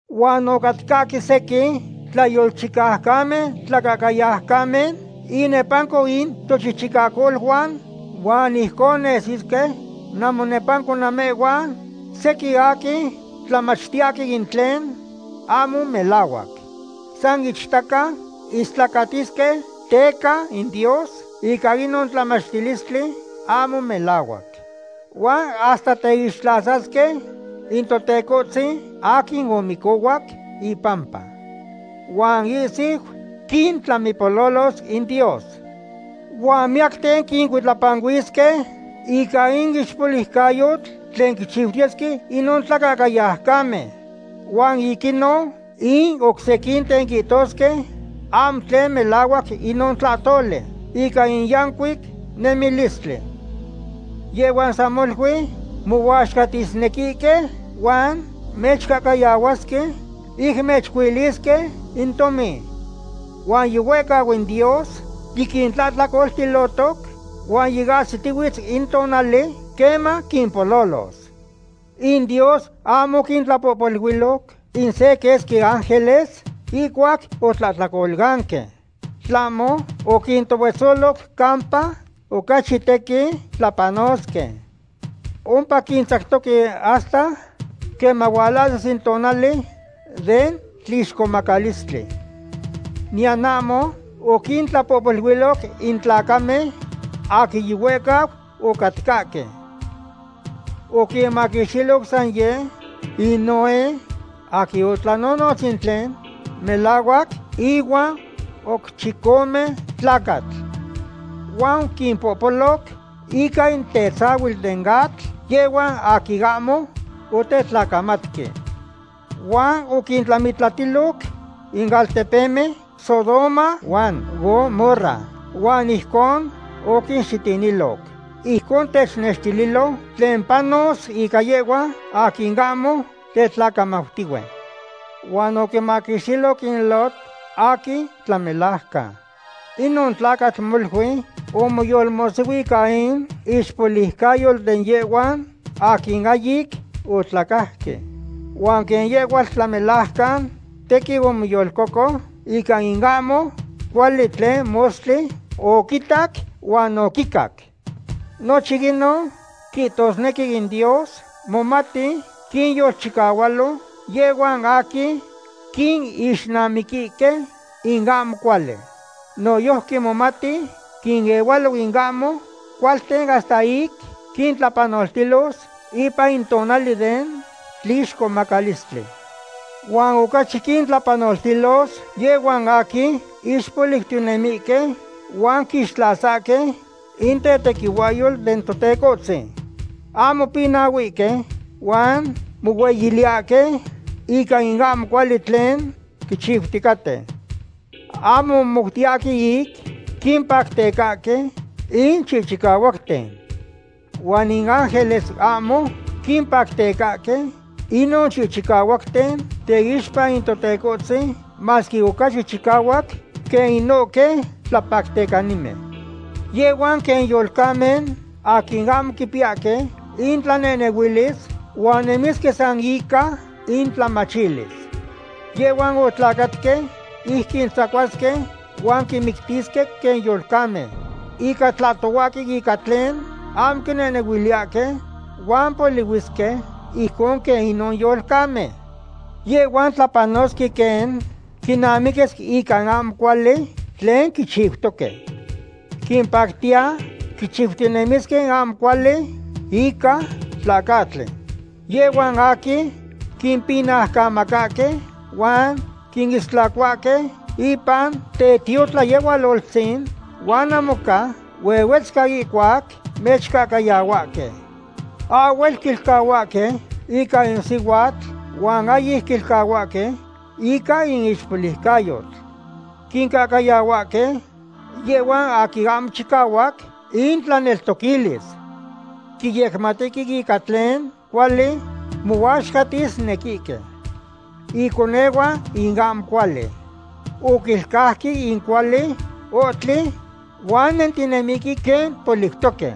Huan ocatcahque sequin tlayolchicaucamen tlacahcayaucamen inepanco in tochichicacoluan, huan ijcon nesisque namonepanco namehhuan sequin aquin tlamachtiyahque in tlen ahmo melahuac. San ichtaca istlacatisque teca in Dios ica inon tlamachilistli ahmo melahuac. Huan hasta teixtlasasque in Totecohtzin aquin omicohuac impampa. Huan ihsiu quintlamipololos in Dios. Huan miyacten quincuitlapanuisque ica in ixpoliucayotl tlen quichiutiyesque inon tlacahcayaucamen. Huan ic inon in oc sequinten quihtosque ahmo tlen melahuac inon tlahtoli ica in yancuic nemilistli. Yehhuan san molui mohuaxcatisnequihque huan mechcahcayahuasque ic mechcuilisque in tomin. Huan yihuehcau in Dios yiquintlahtlacoltilotoc, huan yiahsitihuitz in tonali queman quimpololos. In Dios ahmo oquintlapohpoluiloc in se quesqui ángeles ihcuac otlahtlacolanque. Tlahmo oquintohuetzoloc campa ocachi tequin tlapanosque. Ompa quintzactoque hasta queman hualahsis in tonali den tlixcomacalistli. Niyan ahmo oquintlapohpoluiloc in tlacamen aquin yihuehcau ocatcahque. Oquinmaquixtiloc san yeh in Noé, aquin otlanonotz in tlen melahuac, inuan oc chicome tlacatl. Huan oquimpololoc ica in tetzahuitl den atl yehhuan aquin ahmo otetlacamatque. Huan oquintlamitlatiloc in altepemen Sodoma huan Gomorra huan ijcon oquinxitiniloc. Ijcon technextililo tlen panos ica yehhuan aquin ahmo tetlacamautihue. Huan oquimaquixtiloc in Lot, aquin tlamelajcan. Inon tlacatl molui omoyolmohsihui ica in ixpoliucayotl de yehhuan aquin ahyic otlacajque. Huan quen yehhuatl tlamelajcan, tequin omoyolcoco ica in ahmo cuali tlen mostli oquitac huan oquicac. Nochin inon quihtosnequi in Dios momati quinyolchicahualo yehhuan aquin quinixnamiquihque in ahmo cuali. Noyojqui momati quinehualo in ahmo cualten hasta ic quintlapanoltilos ipan in tonali den tlixcomacalistli. Huan ocachi quintlapanoltilos yehhuan aquin ixpoliucanentinemihque huan quixtlasahque in tetequihuahyo in Totecohtzin. Ahmo pinahuihque huan mohueyiliyahque ica in ahmo cuali tlen quichiuticaten. Ahmo momoutiyahque ic quimpactecahque in chicahuacten. Huan in ángeles ahmo quimpactecahque inon chicahuacten teixpa in Totecohtzin, masque ocachi chicahuac quen inohque tlapactecanimen. Yehhuan quen yolcamen aquin ahmo quipiyahque intlanehnehuilis huan nemisque san ica intlamachilis. Yehhuan otlacatque ic quintzacuasque huan quinmictisque quen yolcamen. Ica tlahtohuahque ica tlen ahmo quinehnehuiliyahque, huan polihuisque ijcon quen inon yolcamen. Yehhuan tlapanosque quen quinamiquis ica in ahmo cuali tlen quichiutoque. Quimpactiya quichiutinemisque in ahmo cuali ica tlacahtli. Yehhuan aquin quimpinaucamacahque huan quinistlacohuahque ipan tetiotlayehualoltzin huan namoca huetzcahque ihcuac mechcahcayahuahque. Ahhuel quilcahuahque ica in sihuatl huan ahyic quicahuahque ica in ixpoliucayotl. Quincahcayahuahque yehhuan aquin ahmo chicahuac intlaneltoquilis. Quiyecmatihque ica tlen cuali mohuaxcatisnequihque. Iconehuan in ahmo cuali. Oquilcauque in cuali ohtli, huan nentinemihque quen poliutoque.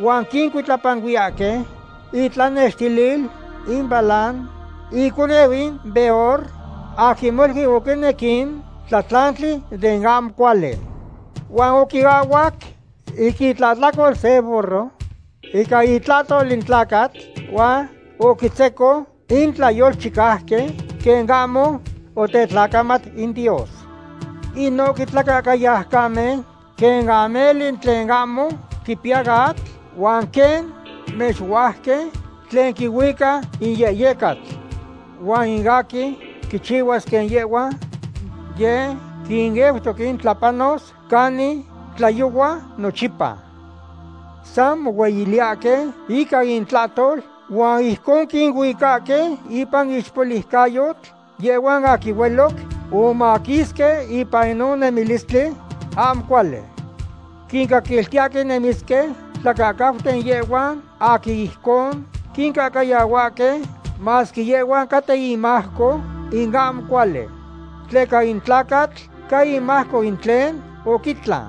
Huan quicuitlapanuiyahque itlanextilil in Balaam, iconeu in Beor, aquin molui oquinec in tlatlantli den ahmo cuali. Huan oquiahhuac ica itlahtlacol se burro ica itlahtol in tlacatl, huan oquitzeco in tlayolchicauqui quen ahmo otetlacamat in Dios. Inohque tlacahcayaucamen quen ameli tlen ahmo quipiya atl, huan quen mexuajqui, tlen quihuica in yehyecatl. Huan in aquin quichihuas quen yehhuan, yeh quineutoque ic tlapanos canin tlayohuayan nochipa. San mohueyiliyahque ica intlahtol, huan ijcon quinuicahque ipan in ixpoliucayotl yehhuan aquin hueloc omaquisque ipan inon nemilistli ahmo cuali. Quincaquiltiyahque nemisque tlacahcauten yehhuan aquin ijcon quincahcayahuahque, masque yehhuan caten imajco in ahmo cuali. Tleca in tlacatl ca imajco in tlen oquitlan.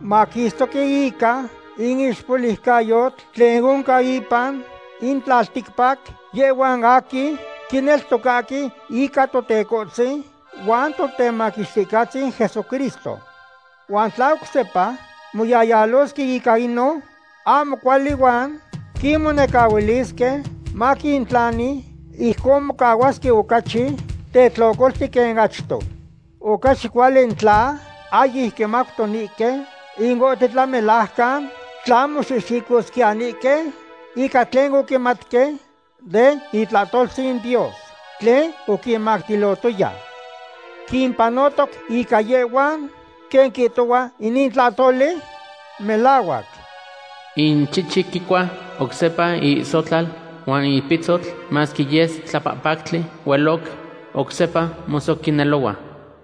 Maquistoque ica in ixpoliucayotl tlen oncan ipan in tlalticpac yehhuan aquin quineltocahque ica Totecohtzin huan Totemaquixticahtzin Jesucristo. Huan tla oc sepa moyayalosque ica inon ahmo cuali huan quimonecahuilisque maquintlani, ijcon mocahuasque ocachi tetlocolti quen achto. Ocachi cuali in tla ahyic quimautonihque in ohtli tlamelajcan, tla moxihxicosquiyanihque ica tlen oquimatque den itlahtoltzin Dios tlen oquinmactilotoya. Quimpanotoc ica yehhuan quen quihtohua inin tlahtoli melahuac. In chichi quicua oc sepa iihsotlal, huan in pitzotl masque yes tlapahpactli hueloc, oc sepa mosoquinelohua.